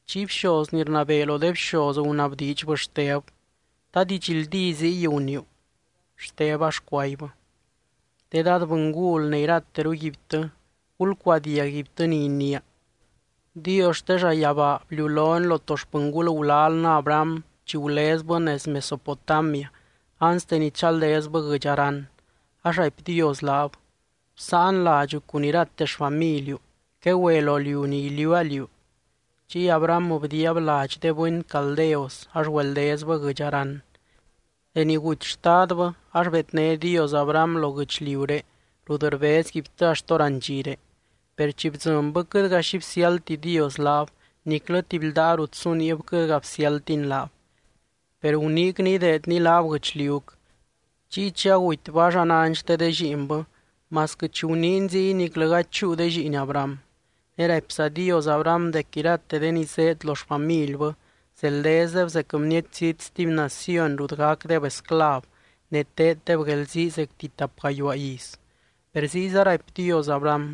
Chiy bxoz ni rnabee lo de bxoz gunabdiidxbɨ Xteb: —¿Ta didxldí ziy guniiu? Xteb ax cuaibbɨ: —De dad bɨngul ne irateruguibtɨ, gulcuadiag guibtɨ ni iniia. Dios xte llayabaa bliulony lo to xpɨngul gulalnɨ Abraham chi gulezbɨ nez Mesopotamia anste ni chaldezbɨ guɨdx Harán. Ax raipy Dios laab: “Bsáan ladxu cun irate xfamiliu. Quegüe lo liu ni iliuua liú.” Chiy Abraham bdiiab ladx de bɨny Caldeos, ax güeldezbɨ guɨdx Harán. Deni guty xtadbɨ, ax bedné Dios Abraham lo guɨchliuré rut rbezguibtɨ axt hórandxire. Per chi bdzɨnbɨ quɨtga xi bsiáldti Dios laab, niclɨ tuby ldaa rut su niib quɨtga bsiáldtiny laab. Per guniicny ideedny laab guɨchliuc. Chiy chi agutybɨ ax anány xte de lliinbɨ, masquɨ chi guniiny ziy niclɨ gady chúu de lliin Abraham. Ne raipza Dios Abraham dec irate de ni zéed lo xfamilbɨ, zeldezdeb zec bniety zít stuby naciony rut gacdeb esclav, ne teeddeb guelzii zecti tap gayuaa iz. Per ziyza raipy Dios Abraham: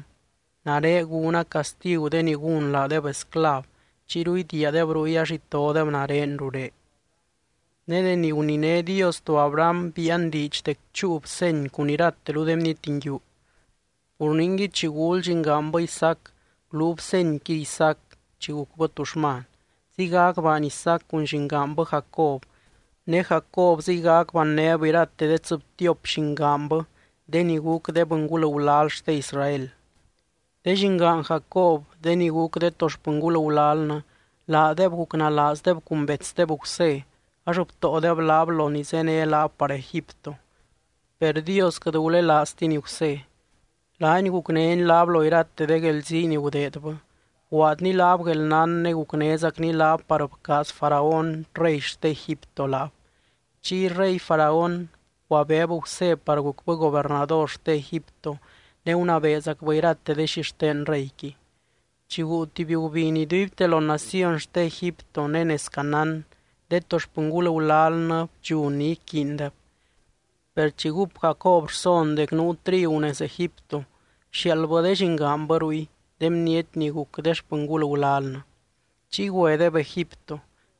“Nare gúna castigu de ni gún laadeb esclav. Chiyru idiiadeb ruy ax itodeb nare ruré.” Ne deni guniné Dios to Abraham biian diidx dec chúub seny cun irateru de bniety nguiu. Pur ningui, chi gul llingaanbɨ Isaac, guluub senyqui Isaac, chi gucbɨ tuxman. Ziygac baany Isaac cun llingaanbɨ Jacob. Ne Jacob ziygac bannéb irate tsɨbtiop llingaanbɨ de ni guc de bɨngul gulal xte Israel. ’De llingaan Jacob de ni guc de to xpɨngul gulalnɨ, laadeb gucnalaazdeb cun betsdeb Gusé. Ax btóodeb laab lo ni zéne laab par Egipto. Per Dios quɨt gulelaaztiny Gusé. Laany gucnény laab lo irate de guelzii ni gudeedbɨ. Bguaadny laab guelnán ne gucnézacny laab par bcaaz Faraón rey xte Egipto laab. Chiy rey Faraón bcuabeeb Gusé par gucbɨ gobernador xte Egipto ne gunabeezacbɨ irate de xixten reyqui. ’Chi guu tuby gubiny iduibte lo naciony xte Egipto ne nez Canaán, de to xpɨngul gulalnɨ bdxun ni iquiindeb. Per chi gúp Jacob rson dec nuu trigu nez Egipto, bxiaaldbɨ de llingaanbɨ ruy, de bniety ni guc de xpɨngul gulalnɨ. Chiy güedeb Egipto.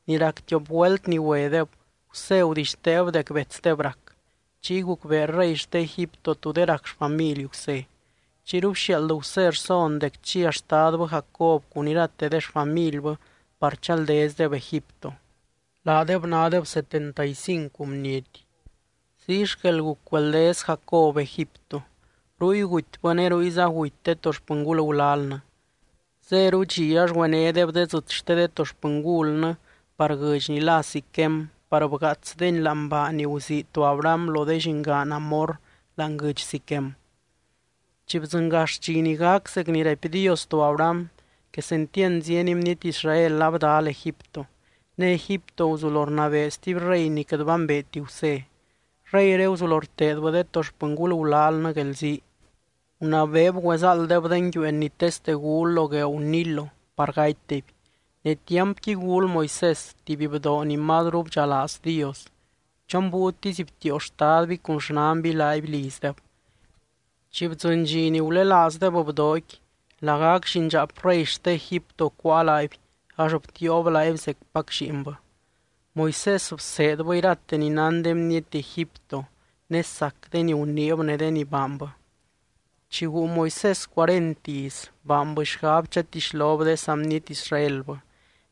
Ni rac tiop güelt ni güedeb, Gusé gudixteeb dec betsdeb rac. Chiy gucbee rey xte Egipto tú de rac xfamily Gusé. Chiyru bxiaald Gusé rson dec chia xtadbɨ Jacob cun irate de xfamilbɨ par chaldezdeb Egipto. Laadeb nádeb setenta y cincu bniety. Ziy xquel guc güeldez Jacob Egipto. Ruy gutybɨ ne ruyza guty de to xpɨngul gulalnɨ. Zéru dxi ax güenédeb de dzɨt xte de to xpɨngulnɨ par guɨdx ni lá Siquem par bgaatsdeni láani baa ni guzii to Abraham lo de llingaan Hamor láani guɨdx Siquem. ’Chi bdzɨngax dxi ni gac zec ni raipy Dios to Abraham, quesentiand zieny bniety Israel abdal Egipto. Ne Egipto guzulo rnabee stuby rey ni quɨt bambeeti Gusé. Reyré guzulo rteedbɨ de to xpɨngul gulalnɨ guelzii. Gunabeeb güezáalddeb de nguiueen ni teste gul lo gueeu Nilo par gatydeby. Ne tiampqui gul Moisés, tuby bdoo ni mazru bdxalaaz Dios. Chon búiutisy btiio xtadby cun xnanby laaby lizdeb. Chi bdzɨny dxi ni gulelaazdeb bdooqui, lagac llindxaap rey xte Egipto cuáa laaby ax btiiob laaby zecpac lliinbɨ. Moisés bseedbɨ irate ni nán de bniety Egipto, ne sac de ni guniib ne de ni baanbɨ. ’Chi guu Moisés cuarent iz, baanbɨ xgab chatixlob de saa bniety Israelbɨ.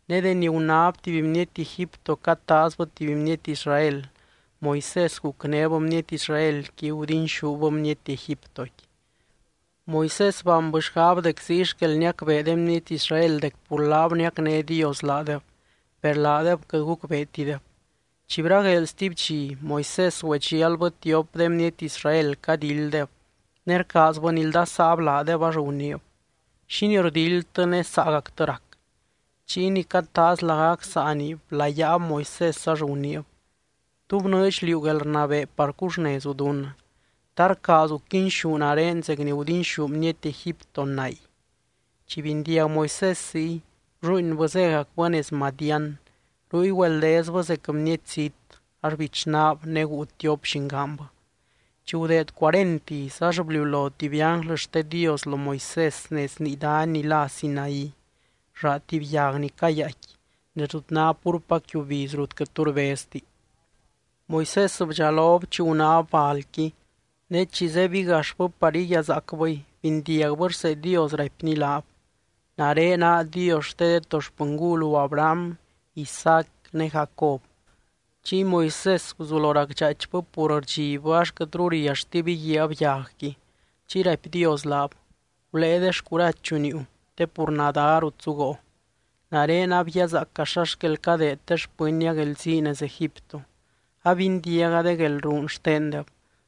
Ne deni gunáb tuby bniety Egipto cataazbɨ tuby bniety Israel, Moisés gucnéb bniety Israelqui, gudinxúb bniety Egiptoqui. Moisés baanbɨ xgab dec ziy xquel niacbee de bniety Israel dec pur laab niacné Dios laadeb, per laadeb quɨt gucbeetideb. Chi bragueel stuby dxi, Moisés güedxialbɨ tiop de bniety Israel cadilddeb, ne rcaazbɨ nildasaab laadeb ax guniib: “¿Xínii rdildtɨ ne saagactɨ rac?” Chiy ni cataaz lagac saani blayaab Moisés ax guniib: “¿Tú bnɨɨdx liú guelrnabee par cuxnezu dunnɨ? ¿Ta rcaazu quinxú nare zec ni gudinxú bniety Egipto nay?” Chi bindiag Moisés ziy, blluuinbɨ, zégacbɨ nez Madián. Ruy güeldezbɨ zec bniety zít, ax bichnaab ne guu tiop llingaanbɨ. ’Chi gudeed cuarent iz, ax bliulo tuby ánglɨ xte Dios lo Moisés nez nii dany ni lá Sinaí, llaa tuby yag ni cayaaicqui, nez rut ná púrpac yiubiz rut quɨt tu rbezti. Moisés bdxalob chi gunáb balqui. Ne chi zebigaxbɨ par iguiazaacbɨy, bindiagbɨ rsee Dios, raipny laab: “Nare naa Dios xte de to xpɨngulu Abraham, Isaac ne Jacob.” Chiy Moisés guzulo racdxaaichbɨ pur rdxibbɨ ax quɨtru rialltib íguiab yagqui. Chiy raipy Dios laab: “Gulée de xcurachu niiu, te pur nadá ná rut zuguoo. Nare abguiazaaca xa xquel cadeed de xpɨnnia guelzii nez Egipto. Abindiaga de guelruun xtendeb.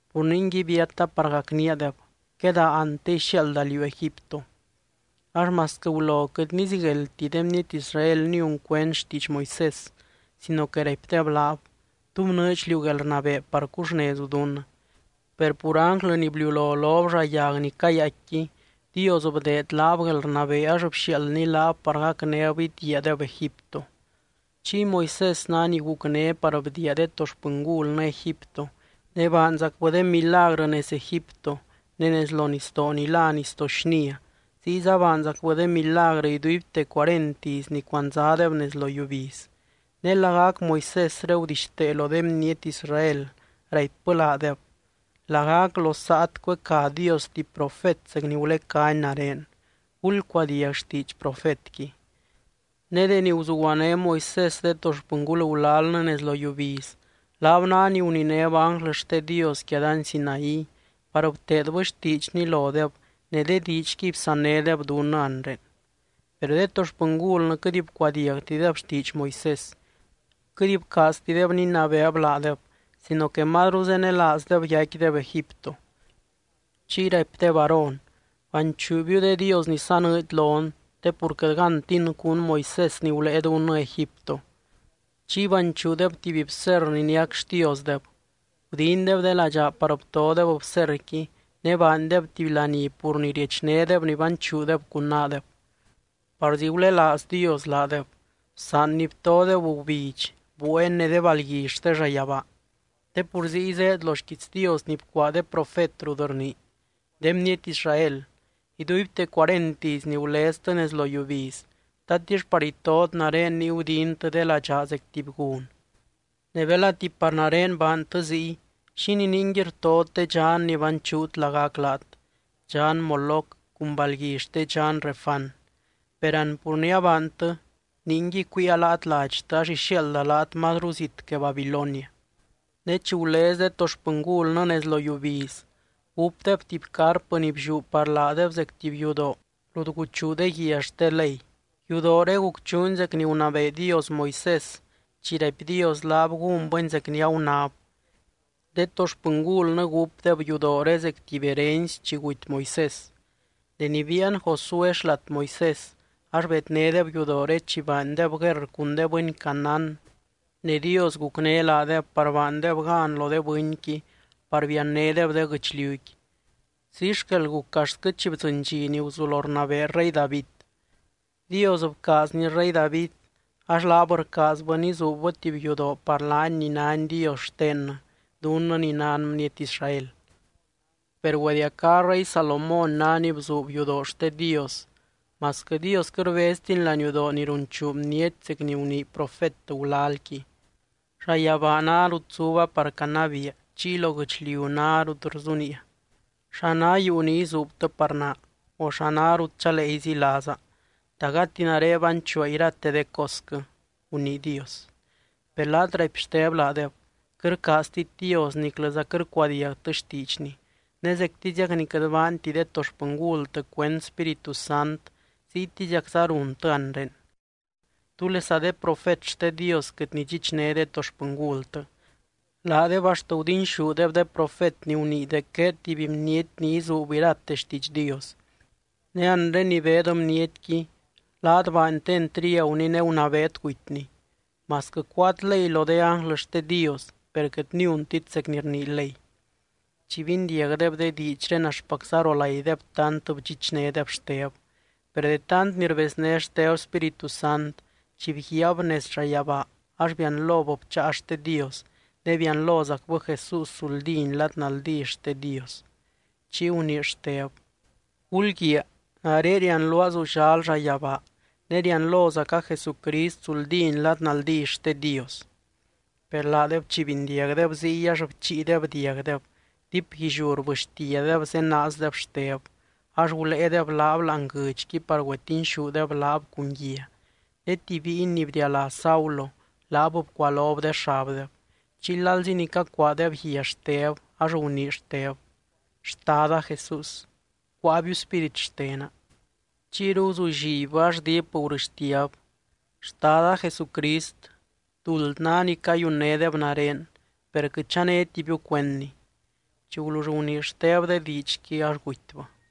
Pur ningui biata par gacníadeb. Quedaa an te ixiaalda liú Egipto.” ’Ax masquɨ gulo quɨt nizigueldti de bniety Israel niun cuend xtiidx Moisés, sino que raipdeb laab: “¿Tú bnɨɨdx liú guelrnabee par cuxnezu dunnɨ?” Per pur ánglɨ ni bliulo lob llaa yag ni cayaaicqui, Dios bdeed laab guelrnabee ax bxiaaldny laab par gacnéb idiiadeb Egipto. Chiy Moisés ná ni gucné par bdiia de to xpɨngulnɨ Egipto, ne baanzacbɨ de milagrɨ nez Egipto, ne nez lo nisdoo ni lá Nisdoo Xnia, ziyza baanzacbɨ de milagrɨ iduibte cuarent iz ni cuandzadeb nez lo yiubiz. Ne lagac Moisésre gudixtee lo de bniety Israel raipbɨ laadeb: “Lagac lo saat cuecá Dios tuby profet zec ni gulecány nare. Gulcuadiag xtiidx Profetqui.” Ne deni guzuguané Moisés de to xpɨngul gulalnɨ nez lo yiubiz, laab ná ni guninéb ánglɨ xte Dios quia dany Sinaí, par bteedbɨ xtiidxny lodeb ne de diidxquiy bsannédeb dunnɨ anre. ’Per de to xpɨngulnɨ quɨt bcuadiagtideb xtiidx Moisés. Quɨt bcaaztideb ninabeeb laadeb, sino que mazru zenelaazdeb yaicquideb Egipto. Chiy raipdeb Aarón: “Banchuubiu de dios ni sanɨɨdy lon, te pur quɨt gántin cún Moisés ni gulée dunnɨ Egipto.” Chiy banchuudeb tuby bserr ni niac xtiosdeb. Gudindeb de ladxaa par btodeb bserrqui ne baandeb tuby laní pur ni riechnédeb ni banchuudeb cun naadeb. Parzi gulelaaz Dios laadeb. Bsaanny btodeb gubidx, bueen ne de balgui xte llayabaa, te pur ziy zéed lo xquiits Dios ni bcuaa de profet rut rnii: De bniety Israel: Iduibte cuarent iz ni guleztɨ nez lo yiubiz, ¿tatix par itot nare niy gudintɨ de ladxaa zec tuby gun? Ne belati par nare baantɨ ziy, ¿xínii ningui rtot de dxan ni banchuut lagac laat, dxan Moloc cun balgui xte dxan Renfán? Per an pur ni abaantɨ, ningui, cuiia laat ladxtɨ ax ixiaalda laat mazru zit que Babilonia. ’Ne chi gulez de to xpɨngulnɨ nez lo yiubiz, gúpdeb tuby carpɨ ni blliú par laadeb zec tuby yudoo rut guchuu de guia xte Ley. Yudooré gucchuuni zec ni gunabee Dios Moisés chi raipy Dios laab gúnbɨni zec ni agunáb. De to xpɨngulnɨ gúpdeb yudooré zec tuby herency chi guty Moisés. Deni biian Josué xlat Moisés, ax bednédeb yudooré chi baandeb guerr cun de bɨny Canaán, ne Dios gucné laadeb par baandeb gan lo de bɨnqui par biannédeb de guɨchliuqui. Ziy xquel guc axtquɨ chi bdzɨny dxi ni guzulo rnabee rey David. Dios bcaazny rey David, ax laab rcaazbɨ nizuubbɨ tuby yudoo par laany ni nány Dios xtennɨ, dunnɨ ni nan bniety Israel. Per güediacá rey Salomón ná ni bzuub yudoo xte Dios, masquɨ Dios quɨt rbeztiny laniudoo ni runchuu bniety zec ni gunii profet gulalqui: Llayabaa ná rut zuba par canabiia. Chiy lo guɨchliu ná rut rzuniia. ¿Xa ná yuu ni izuubtɨ par naa? O, ¿xa ná rut chalee izilaaza? ¿Ta gati nare banchuua irate de cosquɨ?, gunii Dios. ’Per laat —raipy Xteb laadeb— quɨt rcaaztit Dios niclɨza quɨt rcuadiagtɨ xtiidxny. Ne zectiziac ni quɨt baanti de to xpɨngultɨ cuend Spíritu Sant, ziytiziacza runtɨ anre. ¿Túlesa de profet xte Dios quɨt nidxichné de to xpɨngultɨ? Laadeb axt gudinxúdeb de profet ni gunii dec gueed tuby bniety ni izuub irate xtiidx Dios, ne anre ni beed bnietqui, laat baantɨ entriaguny ne gunabeet gutyny. Masquɨ cuáat ley lo de ánglɨ xte Dios, per quɨt niuntit zec ni rnii ley. Chi bindiagdeb de diidxré axtpacza rolaideb tant bdxichnédeb Xteb. Per de tant ni rbezné Xteb Spíritu Sant, chi bguiaab nez llayabaa, ax bianlob bcháa xte Dios. Ne bianlozacbɨ Jesús zuldíny lad naldí xte Dios. Chiy gunii Xteb: —¡Gulguiaa! Nare rianluaa zullal llayabaa, ne rianlozaca Jesucrist zuldíny lad naldí xte Dios. Per laadeb chi bindiagdeb ziy ax bchiideb diagdeb, diipguilliú rbɨxtiadeb zenaazdeb Xteb. Ax guléedeb laab láani guɨdxqui par güetinxúdeb laab cun guia. Ne tuby bíiny ni bdialá Saulo, laab bcualob de xabdeb. Chiy lalzi ni cacuaadeb guia Xteb, ax gunii Xteb: —Xtada Jesús, cuáabiu spírit xtena. Chiyru guzullibbɨ ax diip gurɨxtiab: —Xtada Jesucrist, duld ná ni cayunnédeb nare, per quɨt chanétibiu cuendni. Chi gulull gunii Xteb de diidxqui, ax gutybɨ.